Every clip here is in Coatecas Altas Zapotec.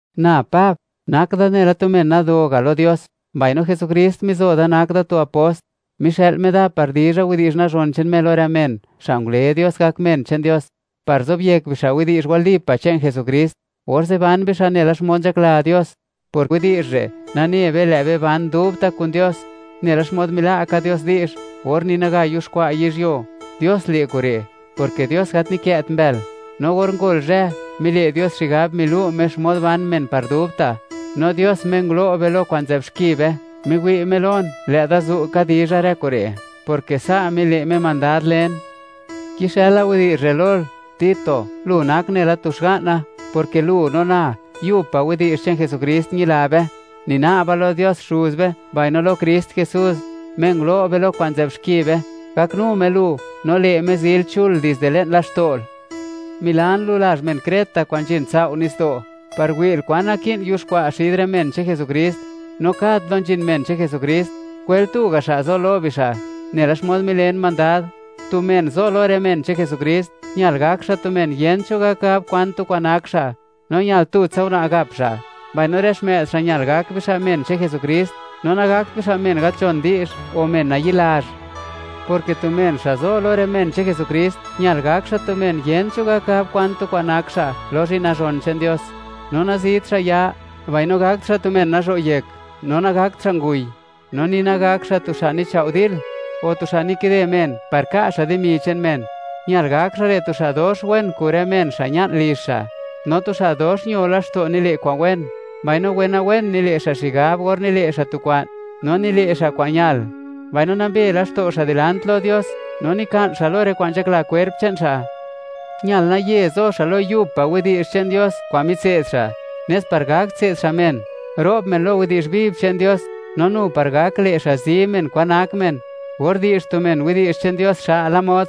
Na Pab, nak da nela tu men nado ga' lo Dios, mbaino Jesukrist mizo da nak da tu apost; mixë'l Me da par dizha widi'zh nazhon che'n Me lo rë men xa' ngule Dios gak men che'n Dios, par zobyek bixa' widi'zh walipa' che'n Jesukrist, orze' ban bixa' nela xmod nzhakla Dios. Por widi'zh re', nane be, lë' be ban dubta' kun Dios, nela xmod mila' ka Dios di'zh, or ni naga yuxkwa' yizhyuo. Dios le' kure', porke Dios gat nikë't mbël. No or ngol zhë, mile' Dios xigab, milu' Me xmod ban men par dubta'. No Dios, Me ngulo' be lo kwa'n nzë'b xki be, miwi' Me lon lë' da zu' ka dizha rë kure', porke sa' mile' Me mandad len. Kixëla widi'zh re' lol, Tito, lu nak nela tu xga'na, porke lu no na, yub pa' widi'zh che'n Jesukrist ñila be. Nina'ba lo Dios Xuz be mbaino lo Krist Jesús, Me ngulo' be lo kwa'n nzë'b xki be, gaknu Me lu, no le' Me, zil chul dizde le'n laxto'l. Milan lu lazh men Creta kwa'n nzhin sao' nitsdo', par wi'l kwan naki'n yuxkwa' xid rë men che'n Jesukrist, no kad plo nzhin men che'n Jesukrist, kwel tu ga' xa' zo lo bixa', nela xmod milen mandad. Tu men zo lo rë men che'n Jesukrist, ñal gak xa' tu men yent cho gak gab kwan tu kwa'n nak xa', no ñal tutsa una' gap xa', mbaino rë xmë'd xa' ñal gak bixa' men che'n Jesukrist, no nagakt bixa' men gat nzhon di'zh o men nayi'lazh, porke tu men xa' zo lo rë men che'n Jesukrist, ñal gak xa' tu men, yent cho gak gab kwan tu kwa'n nak xa' lo zhi'n nazhon che'n Dios. No nazit xa' ya, mbaino gakt xa' tu men nazho' yek, no nagakt xa' nguy, no ni nagak xa' tu xa' nichao' dil, o tu xa' nikide men par ka' xa' dimi che'n men. Ñal gak xa' re' tu xa' dox wen kun rë men xa' ña'n lizh xa', no tu xa' dox ño laxto' nile' kwa'n wen, mbaino wenawen nile' xa' xigab or nile' xa' tu kwa'n, no nile' xa' kwa'n ñal, mbaino nambe laxto' xa' dilant lo Dios, no nika'n xa' lo rë kwa'n nzhakla kwerp che'n xa'. Ñal naye zo xa' lo yub pa' widi'zh che'n Dios kwa'n mitse'd xa', nes par gak tse'd xa' men, ro'b men lo widi'zh viv che'n Dios, no nu par gak le' xa' zi men kwa'n nak men, or di'zh tu men widi'zh che'n Dios xa'la mod,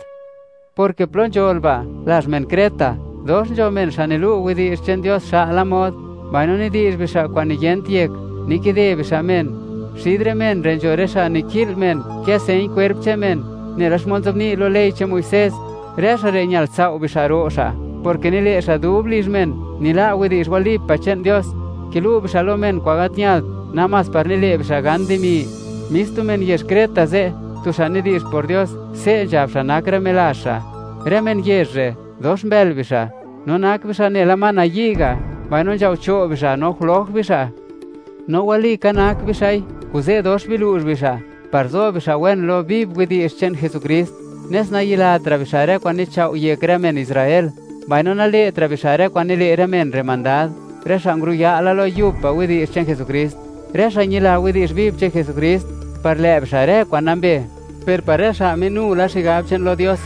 porke plo nzhol ba', lazh men Creta, dox nzho men xa' nilu' widi'zh che'n Dios xa'la mod, mbaino nidi'zh bixa' kwa'n niyent yek, nikide bixa' men. Xid rë men re' nzho rë xa' niki'l men kë' señ kwerp che'n men, nela xmod nzobni' lo ley che'n Muisés. Rë xa' re' ñal sao' be xa' ro' xa', porke nile' xa' dub lizh men nila' widi'zh wali pa' che'n Dios. Kilu' bixa' lo men kwa'n gat ñalt, namás par nile' bixa' gan dimi. Mis tu men yezh Creta ze', tu xa' nidi'zh por Dios, se' nzhab xa' nak rë melazh xa': “Rë men yezh re', dox mbël bixa', no nak bixa' nela ma nayi' ga', mbaino nzhao cho' bixa', no jloj bixa'.” No walika nak bixa'i, kuze' dox bilu'zh bixa' (biza' kunsej bixa'), par zo bixa' wen lo viv widi'zh che'n Jesukrist, nes nayilatra' bixa' rë kwa'n nichao' yek rë men Israel, mbaino nale'tra' bixa' rë kwa'n nile' rë men re' mandad, rë xa' nguruya' la lo yub pa' widi'zh che'n Jesukrist. Rë xa' ñila widi'zh viv che'n Jesukrist, par lë' bixa' rë kwa'n nambe; per par rë xa' minu la xigab che'n lo Dios,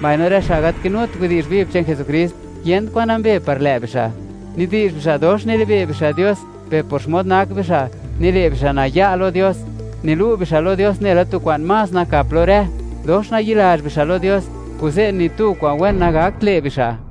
mbaino rë xa' gat kinut widi'zh viv che'n Jesukrist, yent kwa'n nambe par lë' bixa'. Nidi'zh bixa', dox nilibe' bixa' Dios, per por xmod nak bixa', nile' bixa' naya' lo Dios. Nilu' bixa' lo Dios nela tu kwa'n más nakap lo rë. Dox nayi'lazh bixa' lo Dios, kuze' ni tu kwa'n wen nagakt le' bixa'.